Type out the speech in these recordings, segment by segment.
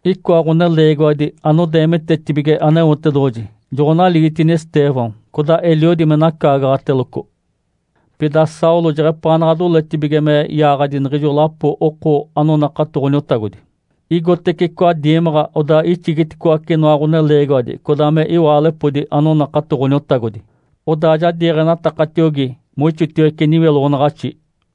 Icoa ɡ̶oneleegiwadi anodeemitetibige Aneotedoɡ̶oji joɡ̶onaligitini Estêvão, codaa eliodi me nacaagaɡ̶ateloco. Pida Saulo jeɡ̶epaanaɡ̶a doletibige me yaaɡ̶adi niɡ̶ijo lapo oko anonakato Ǥoniotagodi. Igotece icoa diimaɡ̶a, odaa ixigiticoace inoa ɡ̶oneleegiwadi codaa me iwaalepodi anonakato Ǥoniotagodi, odaa ja diiɡ̶enatakatiogi moixotiwece niwiloɡ̶onaɡ̶axi.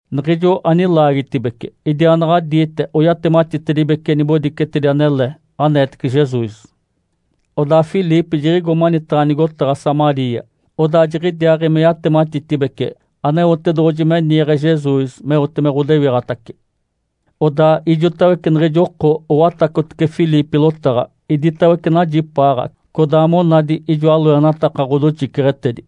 Niɡ̶ijo anilaagitibece idiaanaɡ̶adiite oyatematitedibece nibodicetedi anele aneetece Jesus. Odaa Filipe jiɡ̶igo manitaɡ̶a nigotaɡ̶a Samaria, odaa jiɡ̶idiaaɡ̶i me yatematitibece Aneotedoɡ̶oji me niiɡ̶e Jesus meote me ɡ̶odewiɡ̶atace. Odaa ijotawece niɡ̶ijo oko owatacotece Filipe lotaɡ̶a. Iditawece najipaaɡ̶a, codaa monadi ijoa loenataka ɡ̶odoxiceɡ̶etedi.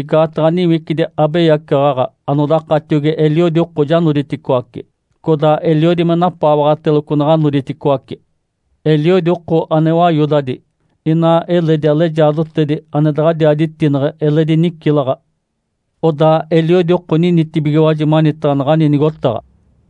Igaataɡ̶a niwicidi abeyacaɡ̶aɡ̶a anodakatiogi eliodi oko ja noditicoaci, codaa eliodi me napaawaɡ̶ateloco naɡ̶a noditicoaci. Eliodi oko ane wayodadi inaa eledi alejaadotedi ane daɡ̶adiaa ditineɡ̶e eledi nicilaɡ̶a. Odaa eliodi oko ninitibigiwaji manitaɡ̶a naɡ̶ani nigotaɡ̶a.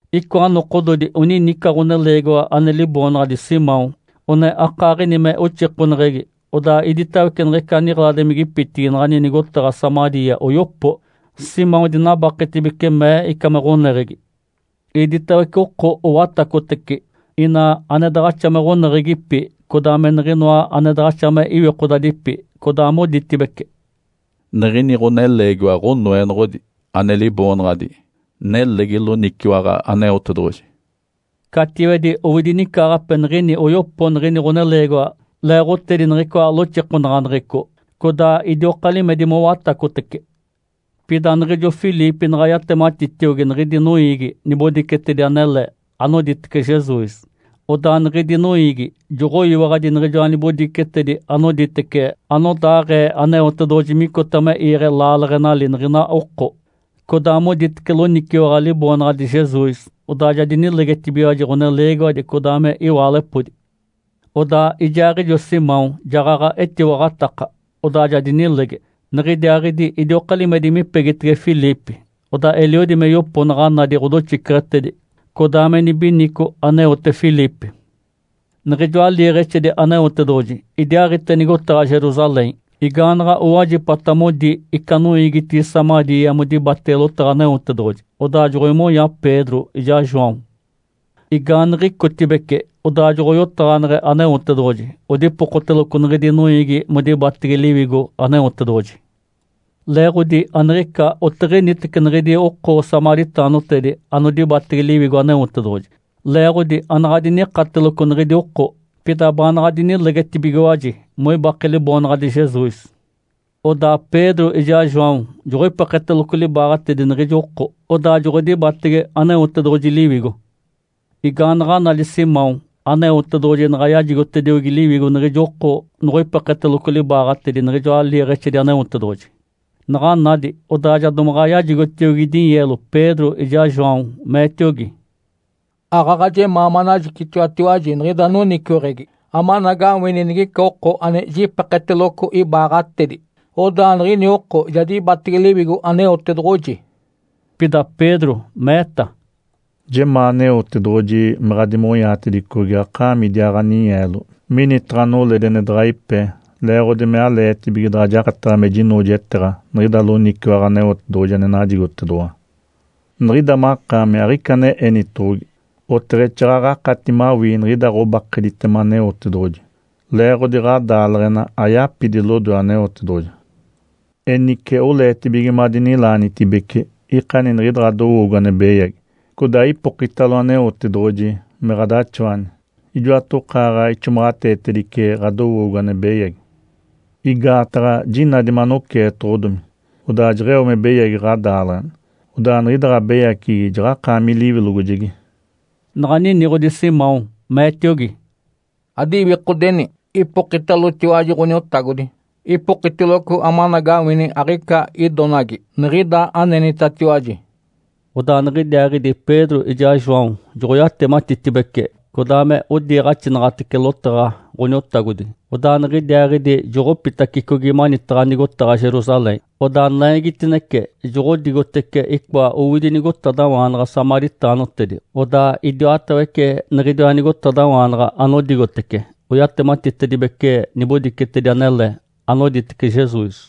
Icoa nokododi onini ica ɡ̶oneleegiwa ane liboonaɡ̶adi Simão one akaaɡ̶ini me oxikoneɡ̶egi, odaa iditawece niɡ̶ica niɡ̶eladimigipitigi naɡ̶ani nigotaɡ̶a Samaria oyopo. Simão dinabaketibece, mee ica me ɡ̶oneɡ̶egi. Iditawece oko owatacotece, ina ane daɡ̶axa me ɡ̶oneɡ̶egipi codaa me niɡ̶inoa ane daɡ̶axa me iwikodadipi codaa moditibece, “Niɡ̶ini ɡ̶oneleegiwa ɡ̶onoenoɡ̶odi ane liboonaɡ̶adi ‘Nelegi loniciwaɡ̶a aneotedoɡ̶oji’.” Catiwedi owidi nicaaɡ̶ape niɡ̶ini oyopo niɡ̶ini ɡ̶oneleegiwa leeɡ̶otedi niɡ̶icoa loxikonaɡ̶aneɡ̶eco, codaa idioka limedi mowatacotece. Pida niɡ̶ijo Filipe naɡ̶a yatematitiogi niɡ̶idi noiigi nibodicetedi anele anoditece Jesus, odaa niɡ̶idi noiigi joɡ̶oyiwaɡ̶adi niɡ̶ijoa nibodicetedi anoditece anodaaɡ̶ee Aneotedoɡ̶oji micota me iiɡ̶e laaleɡ̶enali niɡ̶ina oko, codaa moditece loniciwaɡ̶a Liboonaɡ̶adi Jesus. Odaa ja dinilegetibigiwaji, ɡ̶oneleegiwadi codaa me iwaalepodi. Odaa ijaaɡ̶ijo Simão jaɡ̶aɡ̶a etiwaɡ̶ataka, odaa ja dinilege. Niɡ̶idiaaɡ̶idi idioka limedi mipegitege Filipe, odaa eliodi me yopo naɡ̶a nadi ɡ̶odoxiceɡ̶etedi codaa me nibinico aneote Filipe. Niɡ̶ijoa liiɡ̶exedi Aneotedoɡ̶oji idiaaɡ̶ite nigotaɡ̶a Jerusalém. Igaanaɡ̶a owajipata modi ica noiigitigi Samaria modibatege lotaɡ̶a Aneotedoɡ̶oji, odaa joɡ̶oimonya Pedro ijaa João. Igaaniɡ̶icotibece, odaa joɡ̶oyotaɡ̶aneɡ̶e Aneotedoɡ̶oji, odipokoteloco niɡ̶idi noiigi modibatege Liwigo Aneotedoɡ̶oji. Leeɡ̶odi aniɡ̶ica otiɡ̶initece niɡ̶idi oko samaritaanotedi ane dibatege Liwigo Aneotedoɡ̶oji, leeɡ̶odi anaɡ̶a dinikateloco niɡ̶idi oko. Pida baanaɡ̶a dinilegetibigiwaji moibake Liboonaɡ̶adi Jesus. Odaa Pedro ijaa João joɡ̶oipeketeloco libaaɡ̶atedi niɡ̶ijo oko, odaa joɡ̶odibatege Aneotedoɡ̶oji Liwigo. Igaanaɡ̶a nadi Simão Aneotedoɡ̶oji naɡ̶a yajigotediogi Liwigo niɡ̶ijo oko noɡ̶oipeketeloco libaaɡ̶atedi niɡ̶ijoa liiɡ̶exedi Aneotedoɡ̶oji, naɡ̶a nadi, odaa ja domaɡ̶a yajigotiogi dinyeelo Pedro ijaa João, meetiogi, “Aaɡ̶aɡ̶a jemaa manajicitiwatiwaji niɡ̶ida noniciweɡ̶egi amanagawini nigica oko ane jipeketeloco ibaaɡ̶atedi, odaa niɡ̶ini oko ja dibatege Liwigo Aneotedoɡ̶oji.” Pida Pedro meeta, “Jemaa Aneotedoɡ̶oji me ɡ̶adimonyaatedicogi akaami idiaa ɡ̶aninyeelo minitaɡ̶a noledi ane daɡ̶a ipe leeɡ̶odi me aleetibige daɡ̶a jakataɡ̶a me jinoojeteeɡ̶a niɡ̶ida loniciwaɡ̶a Aneotedoɡ̶oji ane najigotedoɡ̶owa. Niɡ̶ida makaami aɡ̶ica ane enitoɡ̶ogi, oteɡ̶exaaɡ̶aɡ̶a akati mawii niɡ̶ida ɡ̶obakeditema Aneotedoɡ̶oji, leeɡ̶odi ɡ̶adaaleɡ̶ena ayapidi lodoe Aneotedoɡ̶oji. Enice oleetibige madinilaanitibece, ikani niɡ̶ida ɡ̶adowoogo ane beyagi, codaa ipokitalo Aneotedoɡ̶oji me ɡ̶adaxawani. Ijoatokaaɡ̶a ixomaɡ̶ateetedice ɡ̶adowoogo ane beyagi. Igaataɡ̶a jinadi manoceetoɡ̶odomi, odaa jeɡ̶eo me beyagi ɡ̶adaaleɡ̶ena. Odaa niɡ̶ida ɡ̶abeyaceɡ̶egi jaɡ̶akaami liwilogojegi.” Naɡ̶a niniɡ̶odi Simão, meetiogi, “Adiwikodeni, ipokitalotiwaji Ǥoniotagodi, ipokitiloco amanagawini aɡ̶ica idonagi niɡ̶ida anenitatiwaji.” Odaa niɡ̶idiaaɡ̶idi Pedro ijaa João joɡ̶oyatematitibece codaa me odiiɡ̶axinaɡ̶atece lotaɡ̶a Ǥoniotagodi. Odaa niɡ̶idiaaɡ̶idi joɡ̶opitacicogi manitaɡ̶a nigotaɡ̶a Jerusalém. Odaa naigitinece joɡ̶odigotece icoa owidi nigotadawaanaɡ̶a samaritaanotedi, odaa idiwatawece niɡ̶idiwa nigotadawaanaɡ̶a anodigotece oyatematitedibece nibodicetedi anele anoditece Jesus.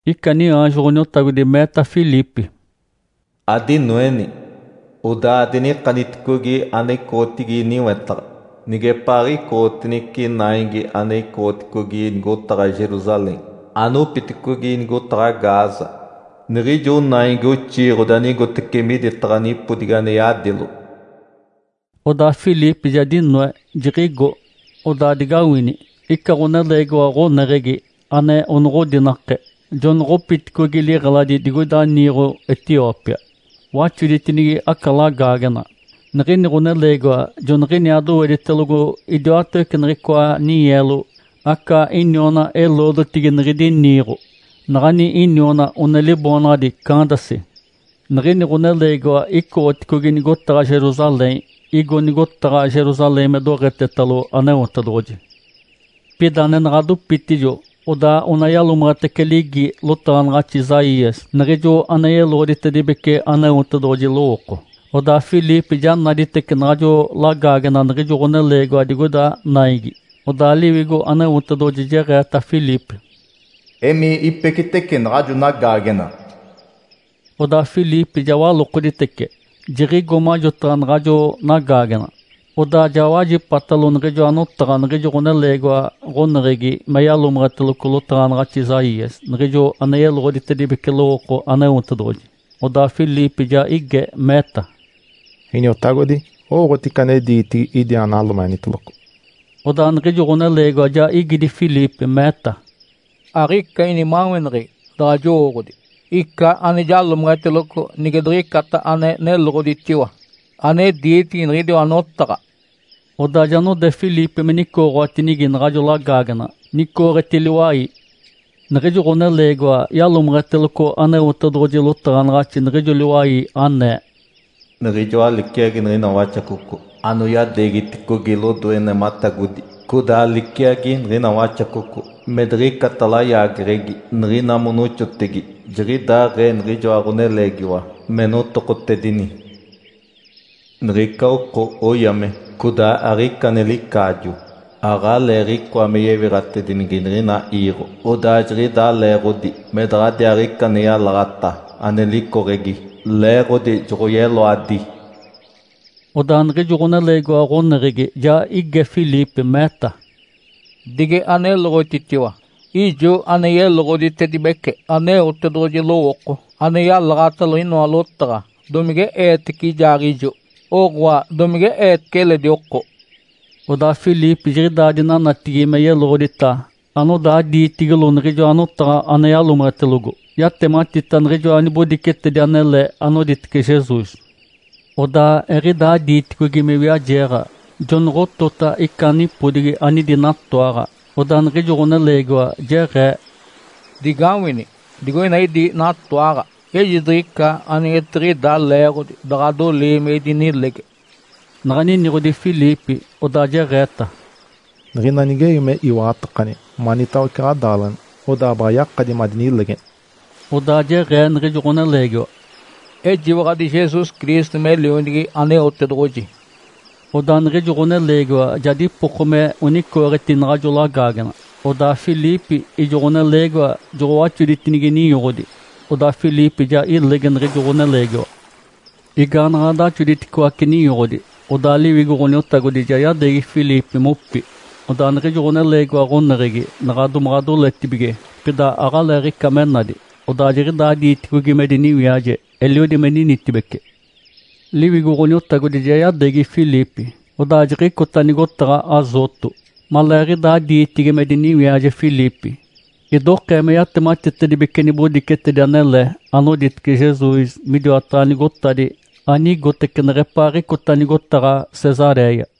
Ica niaanjo Ǥoniotagodi meeta Filipe, “Adinoeni, odaa adinikaniticogi ane icoɡ̶otigi niwetaɡ̶a nigepaaɡ̶icootinece naigi ane icoɡ̶oticogi nigotaɡ̶a Jerusalém anopiticogi nigotaɡ̶a Gaza, niɡ̶ijo naigi oxiiɡ̶odi anigotece miditaɡ̶a nipodigi ane yadilo.” Odaa Filipe ja dinoe, jiɡ̶igo. Odaa digawini, ica ɡ̶oneleegiwa ɡ̶oneɡ̶egi, ane onoɡ̶odinake, jonoɡ̶opiticogi liɡ̶eladi digoida niiɡ̶o Etiópia, waxoditinigi aca lagaagena. Niɡ̶ini ɡ̶oneleegiwa joniɡ̶iniaa doweditelogo idiwatawece niɡ̶icoa ninyeelo aca iniona-eloodotigi niɡ̶idi niiɡ̶o, naɡ̶ani iniona one liboonaɡ̶adi Candace. Niɡ̶ini ɡ̶oneleegiwa icoɡ̶oticogi nigotaɡ̶a Jerusalém. Igo nigotaɡ̶a Jerusalém me doɡ̶etetalo Aneotedoɡ̶oji. Pida nenaɡ̶a dopitijo odaa one yalomeɡ̶etece ligi lotaɡ̶anaɡ̶axi Isaías, niɡ̶ijo ane yeloɡ̶oditedibece Aneotedoɡ̶oji lowooko. Odaa Filipe ja naditece naɡ̶ajo lagaagena niɡ̶ijo ɡ̶oneleegiwa digoida naigi. Odaa Liwigo Aneotedoɡ̶oji jeɡ̶eeta Filipe, “Emii ipecitece naɡ̶ajo nagaagena.” Odaa Filipe ja walokoditece, jiɡ̶igo majotaɡ̶a naɡ̶ajo nagaagena, odaa ja wajipatalo niɡ̶ijoa notaɡ̶a niɡ̶ijo ɡ̶oneleegiwa ɡ̶oneɡ̶egi me yalomeɡ̶eteloco lotaɡ̶anaɡ̶axi Isaías, niɡ̶ijo ane yeloɡ̶oditedibece lowooko Aneotedoɡ̶oji. Odaa Filipe ja ige, meeta, “Iniotagodi, owooɡ̶oti ica ane diitigi idi analomeɡ̶eniteloco?” Odaa niɡ̶ijo ɡ̶oneleegiwa ja igidi Filipe, meeta, “Aɡ̶ica inimaweneɡ̶egi daɡ̶a jowooɡ̶odi ica ane jalomeɡ̶eteloco nige diɡ̶icata ane neloɡ̶oditiwa ane diitigi niɡ̶idiwa notaɡ̶a.” Odaa ja node Filipe me nicooɡ̶owatinigi naɡ̶ajo lagaagena, nicooɡ̶eti liwai. Niɡ̶ijo ɡ̶oneleegiwa yalomeɡ̶eteloco Aneotedoɡ̶oji lotaɡ̶anaɡ̶axi, niɡ̶ijo liwai anee, “Niɡ̶ijoa liciagi niɡ̶ina waxacoco anoyadeegiticogi lodoe nematagodi, codaa liciagi niɡ̶ina waxacoco me diɡ̶icata layaageɡ̶egi niɡ̶ina monoxotegi, jiɡ̶idaaɡ̶ee niɡ̶ijoa Ǥoneleegiwa me notokotedini. Niɡ̶ica oko oyame, codaa aɡ̶ica ane licaajo. Aɡ̶aleeɡ̶icoa me yewiɡ̶atedinigi niɡ̶ina iiɡ̶o, odaa jiɡ̶idaa leeɡ̶odi me daɡ̶adiaaɡ̶ica ane yalaɡ̶ata ane licoɡ̶egi, leeɡ̶odi joɡ̶oyeloadi.” Odaa niɡ̶ijo ɡ̶oneleegiwa ɡ̶oneɡ̶egi ja ige Filipe, meeta, “Dige aneloɡ̶otitiwa! Ijo ane yeloɡ̶oditedibece Aneotedoɡ̶oji lowooko ane yalaɡ̶atalo inoa lotaɡ̶a, domige eetece ijaaɡ̶ijo, oɡ̶oa, domige eetece eledi oko?” Odaa Filipe jiɡ̶idaa dinanatigi me yeloɡ̶odita anodaa diitigilo niɡ̶ijoa notaɡ̶a ane yalomeɡ̶etelogo. Yatematita niɡ̶ijoa nibodicetedi anele anoditece Jesus. Odaa eɡ̶idaa diiticogi me wiajeeɡ̶a, jonoɡ̶otota ica nipodigi anidi natoaɡ̶a. Odaa niɡ̶ijo ɡ̶oneleegiwa jeɡ̶ee, “Digawini! Digoina idi natoaɡ̶a. Ejidiɡ̶ica anigetiɡ̶ida leeɡ̶odi daɡ̶a adolii me idinilege.” Naɡ̶a niniɡ̶odi Filipe, odaa jeɡ̶eeta, “Niɡ̶ina nigewi me iwaɡ̶atakani manitawece ɡ̶adaaleɡ̶ena, odaa baɡ̶a yakadi madinilegeni.” Odaa jeɡ̶ee niɡ̶ijo ɡ̶oneleegiwa, “Ejiwaɡ̶adi Jesus Cristo me Lionigi Aneotedoɡ̶oji.” Odaa niɡ̶ijo ɡ̶oneleegiwa ja dipoko me onicooɡ̶etini naɡ̶ajo lagaagena, odaa Filipe, ijo ɡ̶oneleegiwa joɡ̶owaxoditinigi ninyoɡ̶odi, odaa Filipe ja ilege niɡ̶ijo ɡ̶oneleegiwa. Igaanaɡ̶a daxoditicoace ninyoɡ̶odi, odaa Liwigo Ǥoniotagodi ja yadeegi Filipe mopi. Odaa niɡ̶ijo ɡ̶oneleegiwa ɡ̶oneɡ̶egi naɡ̶a domaɡ̶a doletibige, pida aɡ̶aleeɡ̶ica me nadi, odaa jiɡ̶idaa diitacicogi me diniwiaje, eliodi me ninitibece. Liwigo Ǥoniotagodi ja yadeegi Filipe, odaa jiɡ̶icota nigotaɡ̶a Azoto. Maleeɡ̶idaa diitigi me diniwiaje Filipe, idokee me yatematitedibece nibodicetedi anele anoditece Jesus midiwataɡ̶a nigotadi anigotece neɡ̶epaaɡ̶icota nigotaɡ̶a Cesaréia.